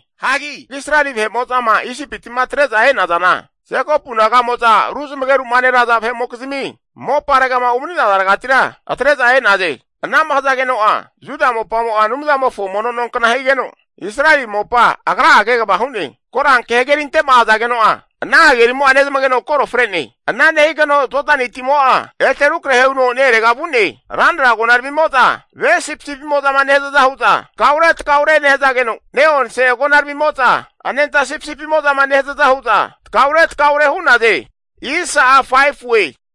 Hagi Israeli vahe'mo'zama Isipiti'ma atre'zama e'nazana, Jekopu naga'mo'za ru zamageru'ma neraza vahe'mokizmi moparegama umani'nazaregatira atre'za e'naze Ana'ma hazageno'a Juda mopamo'a Anumzamofo mono nonkna higeno, Israeli mopa Agra'a kegava hu'ne. Koranke hagerinte'ma azageno'a, ana hagerimo'a nezmageno koro fre'ne. Ana nehigeno Jodani timo'a ete rukrahe huno ne-erega vu'ne. Ranra agonaramimo'za, ve sipisipimo'zama nehazaza hu'za takaure takaure nehazageno, ne'onse agonaramimo'za anenta sipisipimo'zama nehazaza huza takaure takaure hu'naze.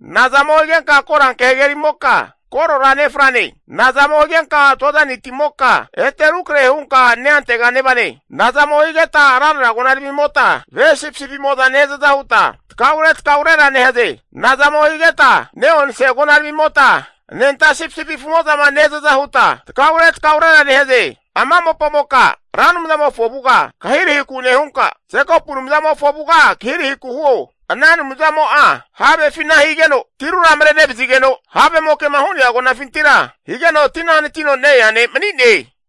Nazamo higenka Koranke hagerimoka, korora nefrane? Nazamo higenka Jodani timoka, ete rukrahe hunka neantega nevane? Nazamo higeta ranra agonaramimota, ve sipisipimo'za nehazaza huta takaure takaurera nehaze? Nazamo higeta ne'onse agonaramimota, anenta sipisipi afumo'zama nehazaza huta takaure takaurera nehaze? Ama mopamoka Ra Anumzamofo avuga kahirahiku nehunka, Jekopu Anumzamofo avuga kahirahiku huo. Ana Anumzamo'a havefina higeno tirura marenevazigeno, havemoke'ma hu'nea agonafintira higeno tina hanatino ne-ea ne' mani'ne.